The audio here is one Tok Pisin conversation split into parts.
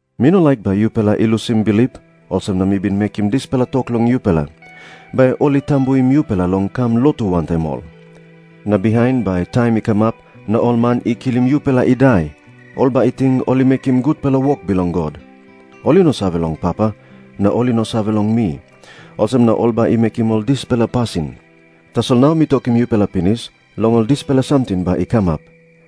“Mi no laik bai yupela i lusim bilip, olsem na mi bin mekim dispela tok long yupela. Bai ol i tambuim yupela long kam lotu wantaim ol. Na bihain bai taim i kamap, na ol man i kilim yupela i dai, ol bai i ting ol i mekim gutpela wok bilong God. Ol i no save long Papa, na ol i no save long mi. Olsem na ol bai i mekim ol dispela pasin. Tasol nau mi tokim yupela pinis long ol dispela samting bai i kamap.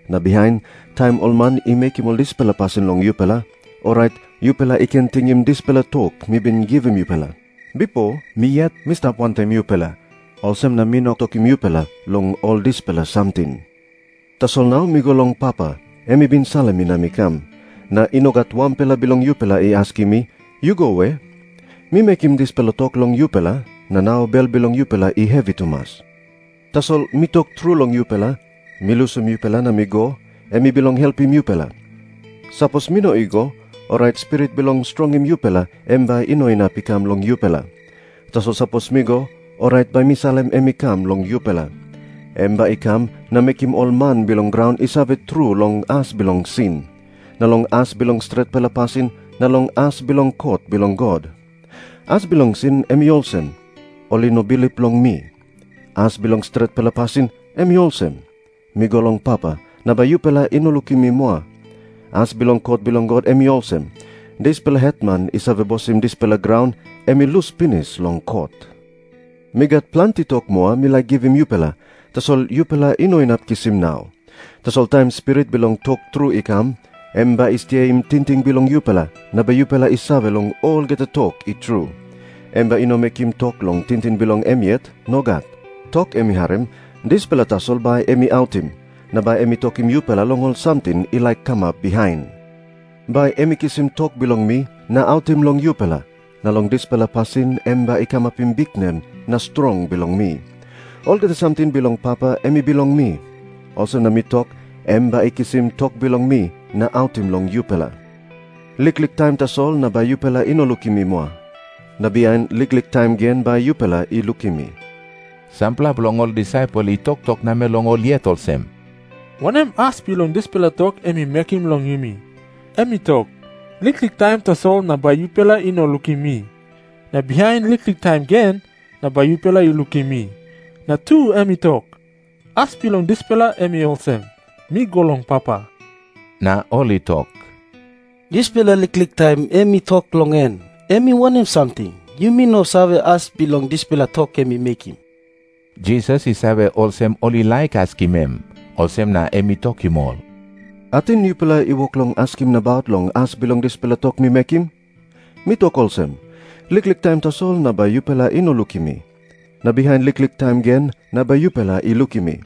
Na bihain, taim ol man i mekim ol dispela pasin long yupela, orait yupela i ken tingim dispela tok mi bin givim yupela.” Jisas i tok moa olsem, “Bipo mi yet mi stap wantaim yupela, olsem na mi no tokim yupela long ol dispela samting. Tasol nau mi go long Papa, em i bin salim mi na mi kam. Na i no gat wanpela bilong yupela i askim mi, ‘Yu go we?’ Mi mekim dispela tok long yupela, na nau bel bilong yupela i hevi tumas. Tasol mi tok tru long yupela, mi lusim yupela na mi go, em i bilong helpim yupela. Sapos mi no i go, orait Spirit bilong strongim yupela em bai i no inap i kam long yupela. Tasol sapos mi go, orait bai mi salim em i kam long yupela. Em bai i kam na mekim ol man bilong graun i save tru long as bilong sin, na long as bilong stretpela pasin, na long as bilong kot bilong God. As bilong sin, em i olsem, ol i no bilip long mi. As bilong stretpela pasin, em i olsem, mi go long Papa, na bai yupela i no lukim mi moa. As bilong kot bilong God, em i olsem, dispela hetman i save bosim dispela graun em i lus pinis long kot. “Mi gat planti tok moa mi laik givim yupela, tasol yupela i no inap kisim nau. Tasol taim Spirit bilong tok tru i kam, em bai i stiaim tingting bilong yupela na bai yupela i save long olgeta tok i tru. Em bai i no mekim tok long tingting bilong em yet. Nogat. Tok em i harim, dispela tasol bai em i autim. Na bai em i tokim yupela long ol samting i laik kamap bihain. Bai em i kisim tok bilong mi na autim long yupela, na long dispela pasin em bai i kamapim biknem na strong bilong mi. Olgeta samting bilong Papa em i bilong mi. Olsem na mi tok, em bai i kisim tok bilong mi na autim long yupela.” Jisas i tok moa olsem, “Liklik taim tasol na bai yupela i no lukim mi moa. Na bihain liklik taim gen na bai yupela i lukim mi.” Sampela bilong ol disaipel i toktok namel long ol yet olsem, “Wanem as bilong dispela tok em i mekim long yumi? Em i tok, ‘Liklik taim tasol na bai yupela i no lukim mi, na bihain liklik taim gen na bai yupela i lukim mi.’ Na tu em i tok, ‘As bilong dispela, em i olsem. Mi go long Papa.’” Na ol i tok, “Dispela ‘liklik taim’ em i tok long en, em i wanem samting? Yumi no save as bilong dispela tok em i mekim.” Jisas i save olsem ol i laik askim em. Olsem na em i tokim ol, “Ating yupela i wok long askim nabaut long as bilong dispela tok mi mekim? Mi tok olsem, ‘Liklik taim tasol na bai yupela i no lukim mi. Na bihain liklik taim gen na bai yupela i lukim mi.’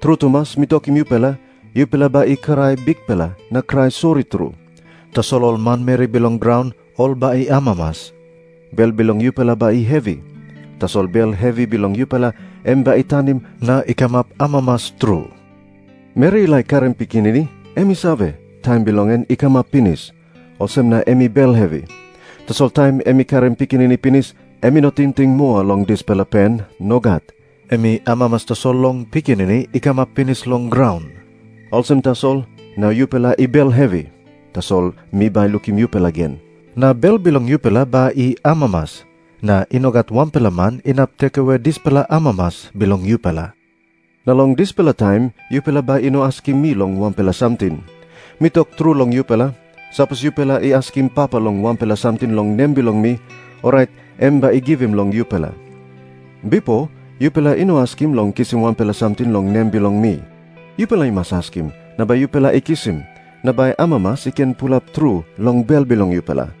Tru tumas mi tokim yupela, yupela bai i krai bikpela na krai sori tru. Tasol ol manmeri bilong graun ol bai i amamas. Bel bilong yupela bai i hevi. Tasol bel hevi bilong yupela em bai i tanim na i kamap amamas tru. Meri i laik karim pikinini, em i save, taim bilong en i kamap pinis. Olsem na em i bel hevi. Tasol taim em i karim pikinini pinis, em i no tingting moa long dispela pen. Nogat. Em i amamas tasol long pikinini i kamap pinis long graun. Olsem tasol, nau yupela i bel hevi. Tasol mi bai lukim yupela gen, na bel bilong yupela bai i amamas. Na i no gat wanpela man inap rausim dispela amamas bilong yupela. Na long dispela taim yupela bai i no askim mi long wanpela samting. Mi tok tru long yupela, sapos yupela i askim Papa long wanpela samting long nem bilong mi, orait em bai i givim long yupela. Bipo yupela i no askim long kisim wanpela samting long nem bilong mi. Yupela i mas askim, na bai yupela i kisim, na bai amamas i ken pulap tru long bel bilong yupela.”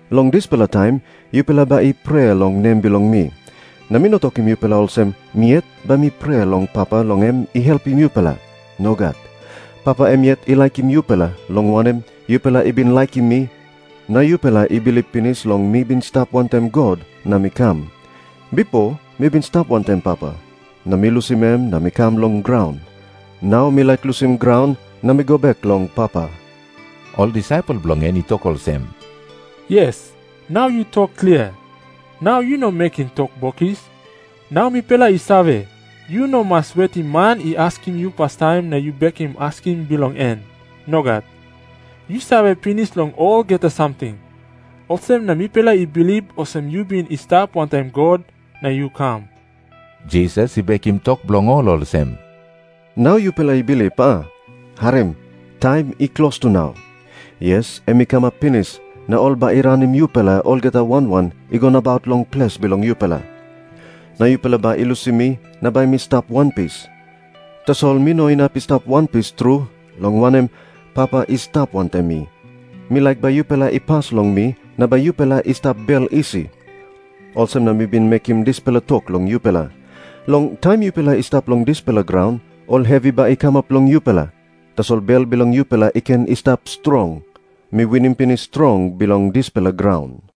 Long dispela taim yupela bai i prea long nem bilong mi. Na mi no tokim yupela olsem, mi yet bai mi prea long Papa long em i helpim yupela. Nogat. Papa em yet i laikim yupela, long wanem, yupela i bin laikim mi, na yupela i bilip pinis long mi bin stap wantaim God na mi kam. Bipo mi bin stap wantaim Papa, na mi lusim em na mi kam long graun. Nau mi laik lusim graun na mi go bek long Papa.” Ol disaipel bilong en i tok olsem, “Yes, nau yu tok klia. Nau yu no mekim tok bokis. Nau mipela i save, yu no mas wetim man i askim yu pastaim na yu bekim askim bilong en. Nogat. Yu save pinis long olgeta samting. Olsem na mipela i bilip olsem yu bin i stap wantaim God na yu kam.” Jisas i bekim tok bilong ol olsem, “Nau yupela i bilip, a? Harim. Taim i klostu nau. Yes, em i kamap pinis, na ol bai i ranim yupela olgeta wan wan i go nabaut long ples bilong yupela. Na yupela bai i lusim mi na bai mi stap wanpis. Tasol mi no inap i stap wanpis tru, long wanem, Papa i stap wantaim mi. Mi laik bai yupela i pas long mi na bai yupela i stap bel isi, olsem na mi bin mekim dispela tok long yupela. Long taim yupela i stap long dispela graun, ol hevi bai i kamap long yupela, tasol bel bilong yupela i ken i stap strong. Mi winim pinis strong bilong dispela graun.”